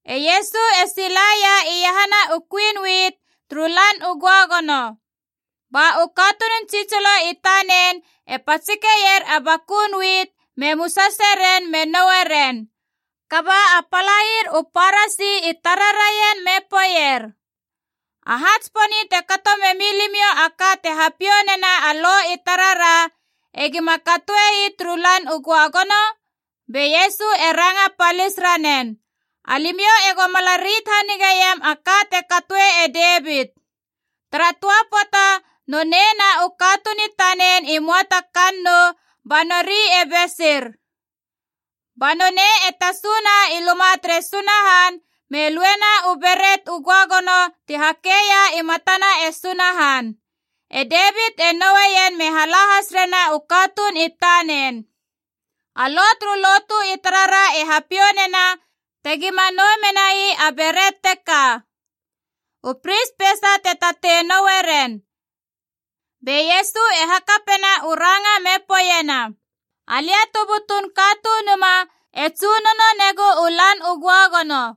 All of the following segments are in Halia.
E Iesu e silaia iahana u kuin wit turu Lan u Göagono. Ba u katunun tsitsilo i tanen e patsikeier a bakun wit me musase ren me noue ren. Kaba a palair u Parasi i tara raien me poeier, “Aha tsiponi te kato memi limiou a ka te hapiou nena a Lo i tarara egima katoe ii turu Lan u Göagono?” Be Iesu e ranga palis ranen, “Alimiou ego mala rit hanigeiam a ka te katoe e Devit. Tara töa pöata nonei na u katuun i tanen i möa ta kannou ba nori e besir. Ba nonei e tasuna i luma tere Sunahan me luena u beret u göagono ti hakeia i matana e Sunahan. E Devit e noueien me hala has rena u katuun i tanen. A Lo turu lotu i tarara e hapiou nena tegima nou menai a beret teka. U pris peisa te tatei noue ren.” Be Iesu e hakapena u ranga me poeiena, “Alia tu butun Katunuma e tsunono negu u Lan u Göagono.”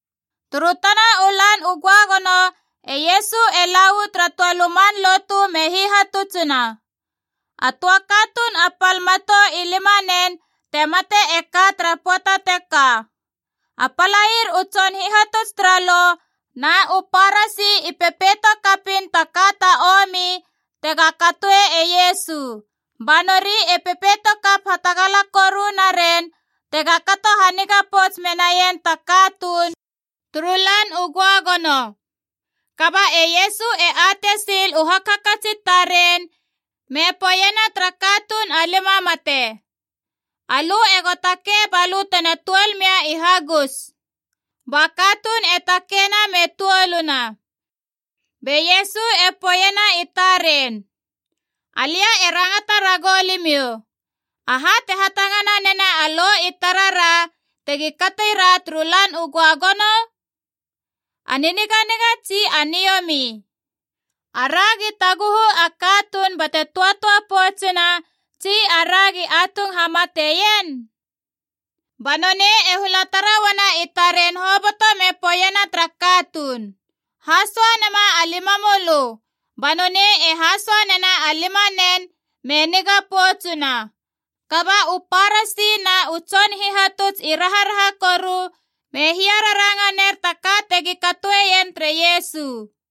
Turu tana u Lan u Göagono e Iesu e la uu tara töa luman lotu me hihatutsina. A töa katuun a pal matou i lima nen te mate e ka tara pöata teka. A palair u tson hihatuts tara Lo na u Parasi i pepeito kapiin ta ka ta omi tega katoe e Iesu. Ba nori e pepeito kap hatagala koru naren tega kato haniga pouts menaien ta katuun turu Lan u Göagono. Kaba e Iesu e atei sil u hakhakats i taren me poeiena tara katuun a limamate, “Alö ego takei ba lö tena tuol mia i hagus.” Ba katuun e takeina me tuoluna. Be Iesu e poeiena i taren, “Alia e rangata ragou limiou, aha te hatangana nena a Lo i tarara tegi kati ra turu Lan u Göagono? A niniganiga tsi a niomi? Aragi taguhu a katuun bate töatöa poutsuna tsi aragi atung hamateien?” Ba nonei e hula tara uana i taren hoboto me poeiena tara katuun, “Hasoa nema a limamölö!” Ba nonei e hasoa nena a limanen me niga poutsuna. Kaba u Parasi na u tson hihatuts i raharaha koru me hiararanga ner ta ka tegi katoeien tere Iesu.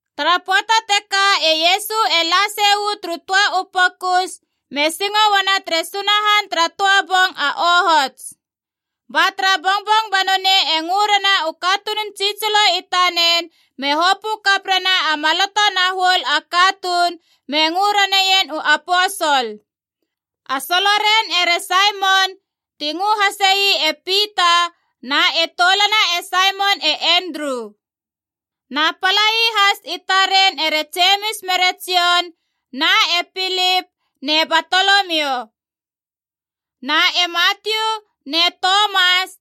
Tara pöata teka e Iesu e la sei uu turu töa u pokus me singo uana tere Sunahan tara töa bong a ohots. Ba tara bongbong ba nonei e ngörena u katunun tsitsilo i tanen me hopö kap rena a maloto na huol a katuun me ngö raneien u aposol. A soloren ere Saimon (ti ngö hasei e Pita) na e toulana e Saimon e Endru. Na palai has i taren ere Jemis mere Jon na e Pilip ne Batolomio. Na e Matiu ne Tomas,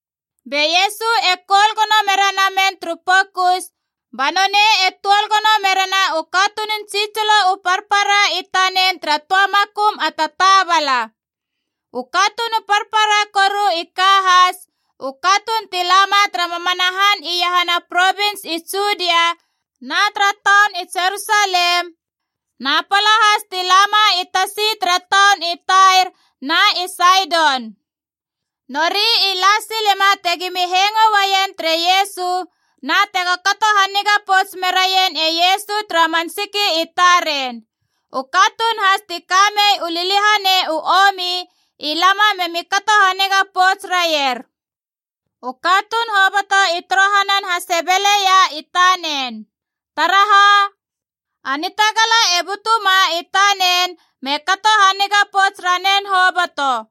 Be Iesu e koul gono mere namen turu pokus, ba nonei e tuol gono merena u katunun tsitsilo u parpara i tanen tara töa makum a tataabala. U katuun u parpara koru i ka has, u katuun ti lama tara mamana han iahana provins i Judia na tara taun i Jerusalem, na pala has ti lama i tasi tara taun i Tair na i Saidon. Nori i la silema tegomi hengo uaien tere Iesu na tego kato haniga pouts meraien e Iesu tara man siki i taren. U katuun has ti ka mei u liliahanei u omi i lama me mi kato haniga pouts raier. U katuun hoboto i torohanan hasebeleia i tanen. Taraha? A nitagala e butuma i tanen me kato haniga pouts ranen hoboto.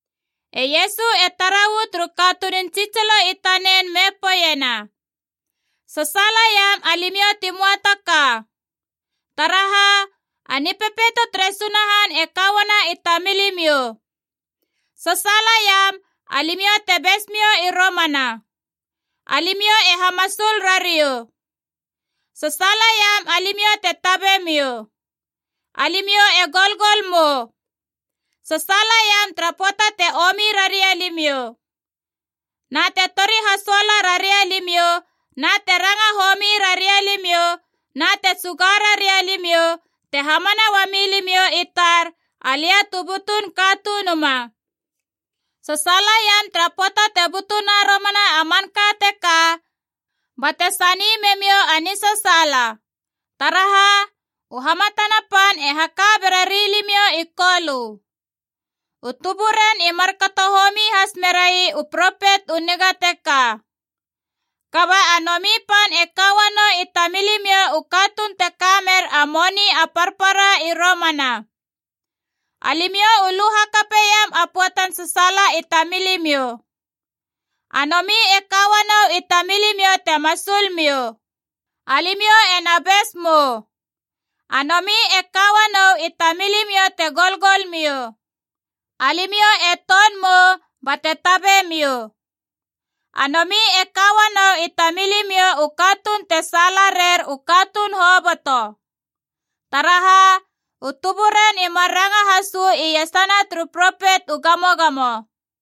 E Iesu e tara uu turu katunun tsitsilo i tanen me poeiena, “Sasaalaiam, alimiou ti möa ta ka. Taraha? A Nipepeito tere Sunahan e ka uana i tamilimiou! Sasaalaiam, alimiou te bes miou i romana. Alimiou e hamasul rariou! Sasaalaiam, alimiou te tabe miou. Alimiou e golgol mou! Sasaalaiam tara pöata te omi raria limiou, na te tori hasoala raria limiou, na te ranga homi raria limiou, na te tsuga raria limiou, te hamana uami limiou i tar, alia tu butun Katunuma.” “Sasaalaiam tara pöata te butuna romana a manka teka, bate sani memiou a nisasaala! Taraha? U hamatana pan e haka bera rilimiou i Kolö. U tuburen i markato homi has merai u propet u niga teka. Kaba a nomi pan e ka uanou i tamilimiou u katuun te ka mer a moni a parpara i romana. Alimiou u lu hakapeiam a pöatan sasaala i tamilimiou. A nomi e ka uanou i tamilimiou te masul miou. Alimiou e na bes mou! A nomi e ka uanou i tamilimiou te golgol miou. Alimiou e ton mou bate tabe miou. A nomi e ka uanou i tamilimiou u katuun te saala rer u katuun hoboto. Taraha? U tuburen i mar ranga has uu iesana turu propet u gamogamo.”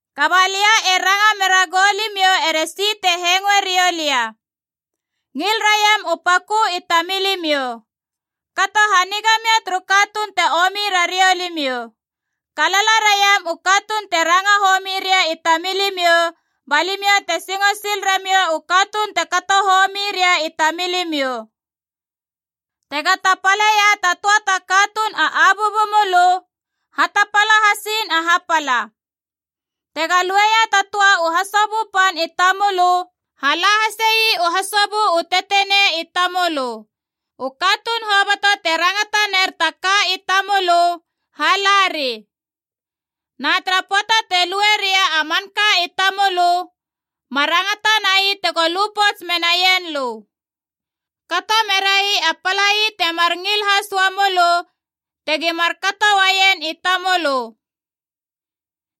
“Kaba lia e ranga mera goulimiou eresi te hengoe riou lia, ngil raiam u pakö i tamilimiou. Kato haniga mia turu katuun te omi rariou limiou. Kalala raiam u katuun te ranga homi ria i tamilimiou, ba limiou te singo sil ramiou u katuun te kato homi ria i tamilimiou. Tega tapaleia ta töa ta katuun a abuabu mölö, hatapala hasiin a hapala. Tega lueia ta töa u hasobö pan i tamölö, hala hasei u hasobö u tetenei i tamölö. U katuun hoboto te rangata ner ta ka i tamölö, halari. Na tara pöata te lue ria a manka i tamölö, ma rangata nai tego lu pouts menaien lö. Kato merai a palai temar ngil has uamölö tegi markato uaien i tamölö.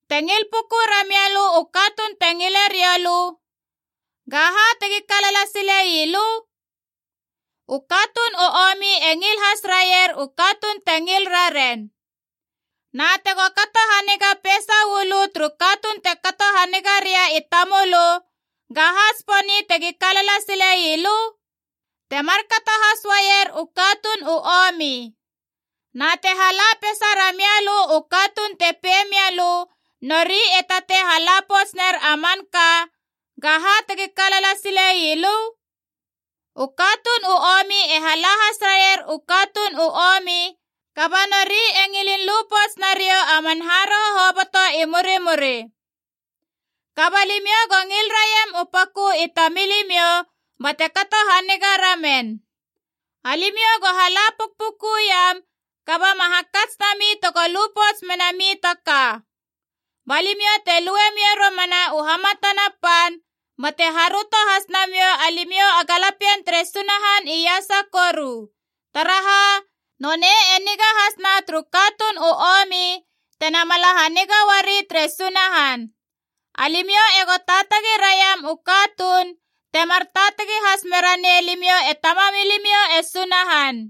“Te ngil puku ramia lö u katuun te ngile rioulö, gaha tegi kalala silei lö? U katuun u omi e ngil has raier u katuun te ngil raren. Na tego kato haniga peisa uu lö turu katuun te kato haniga ria i tamölö, gaha tsiponi tegi kalala silei lö? Te markato has uaier u katuun u omi. Na te hala peisa ramia lö u katuun te pei mia lö nori e tatei hala pouts ner a manka, gaha tegi kalala silei lö? U katuun u omi e hala has raier u katuun u omi, kaba nori e ngilin lu pouts nariou a man haroho hoboto i murimuri. Kaba limiou go ngil raiam u pakö i tamilimiou bate kato haniga ramen. Alimiou go hala pukpukuiam, kaba ma hakats nami tego lu pouts menami ta ka. Ba limiou te lue miou romana u hamatana pan, bate haröto has namiou alimiou a galapien tere Sunahan Iasa Koru. Taraha? Nonei e niga has na turu katuun u omi tena mala haniga uari tere Sunahan. Alimiou ego taatagi raiam u katuun, temar taatagi has mera nei limiou e Tamamilimiou e Sunahan.”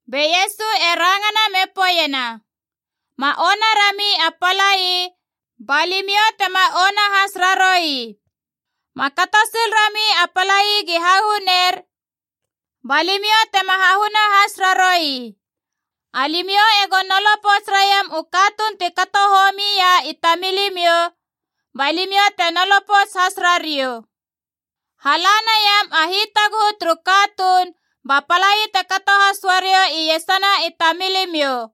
Be Iesu e rangana me poeiena, “Ma ona rami a palai, ba limiou tema ona has raroui. Ma kato sil rami a palai gi hahuner, ba limiou tema hahuna has raroui. Alimiou ego nolo pouts raiam u katuun ti kato homia i tamilimiou, ba limiou te nolo pouts has rariou. Hala naiam a hitaguhu turu katuun ba palai te kato has uariou iesana i tamilimiou.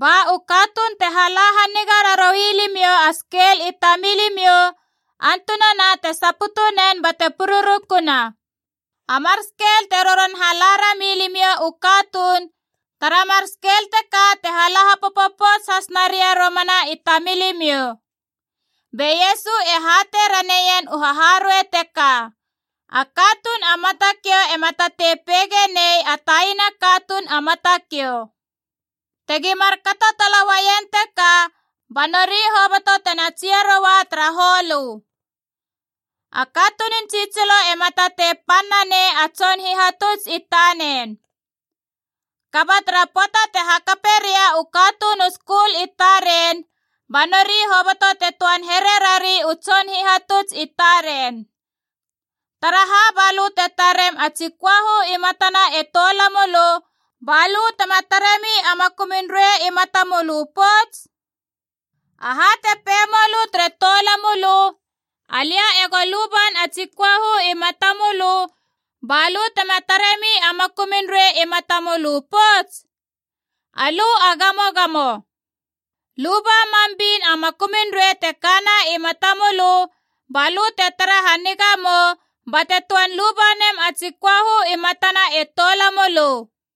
Ba u katuun te hala haniga raroui limiou a skel i tamilimiou antunana te saputu nen bate pururukuna. A mar skel te roron hala rami limiou u katuun, tara mar skel teka te hala hapopo pouts has naria romana i tamilimiou.” Be Iesu e hatei raneien u haharuei teka. “A katuun a matakiou ema tatei peige nei a taina katuun a matakiou. Tegi markato tala uaien teka, ba nori hoboto tena tsia roa tara holö. A katunun tsitsilo ema tatei pan nanei a tson hihatuts i tanen. Kaba tara pöata te hakape ria u katuun u skul i taren, ba nori hoboto te töan here rari u tson hihatuts i taren. Taraha ba lö te tarem a tsi köahu i matana e toulamölö, ba lö tema taremi a makumun ruei i matamölö pouts? Aha te pei mölö tere toulamölö, ‘Alia ego luban a tsi köahu i matamölö’ ba lö tema taremi a makumun ruei i matamölö pouts? Alö a gamogamo! Luba mam bin a makumun ruei te kana i matamölö, ba lö te tara haniga mou bate töan luba nem a tsi köahu i matana e toulamölö.”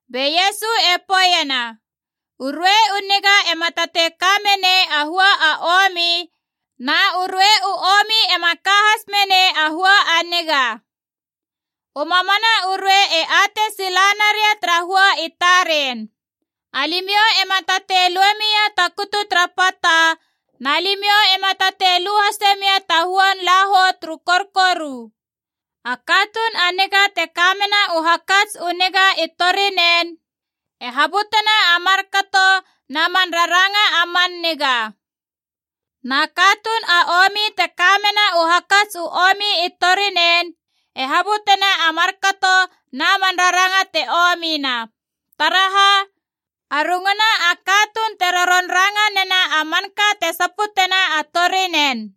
Be Iesu e poeiena, “U ruei u niga ema tatei ka menei a hua a omi, na u ruei u omi ema ka has menei a hua a niga. U mamana u ruei e atei silanaria tara hua i taren. Alimiou ema tatei lue mia ta kutu tara pata, na limiou ema tatei lu hase mia ta huan lahou turu korkoru. A katuun a niga te ka mena u hakats u niga i torinen e habutena a markato na man raranga a man niga. Na katuun a omi te kamena u hakats u omi i torinen e habutena a markato na man raranga te omina. Taraha? A runguna a katuun te roron ranga nena a manka te saputena a torinen.”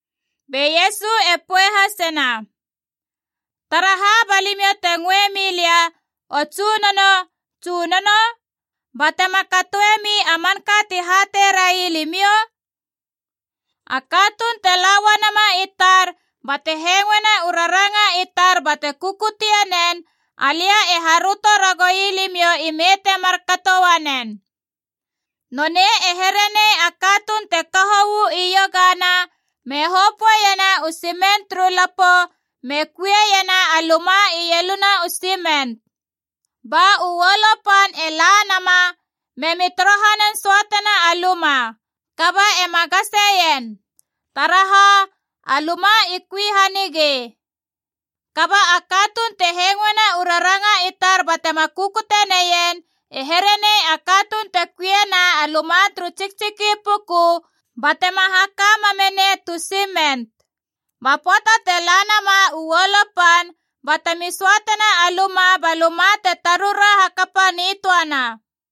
Be Iesu e poei hasena, “Taraha ba limiou te ngöe milia ‘O Tsunono, Tsunono,’ batema katoemi a manka ti hatei rai limiou? A katuun te la uanama i tar bate hengoena u raranga i tar bate kukutie nen, alia e haröto ragoui limiou ime te markato uanen. Nonei e here nei a katuun te kaho uu iogana me hopöeiena u simen turu lapo me kuiena a luma ieluna u simen. Ba u uolo pan e la nama me mi torohanan söatena a luma. Kaba ema gaseien. Taraha? A luma i kui hanigei. Kaba a katuun te hengoena u raranga i tar batema kukutie neien e here nei a katuun te kuiena a luma turu tsiktsiki puku batema haka mamme nei tu simen. Ba pöata te la nama u uolo pan, batemi söatena a luma ba luma te tarura hakapa nitöana.”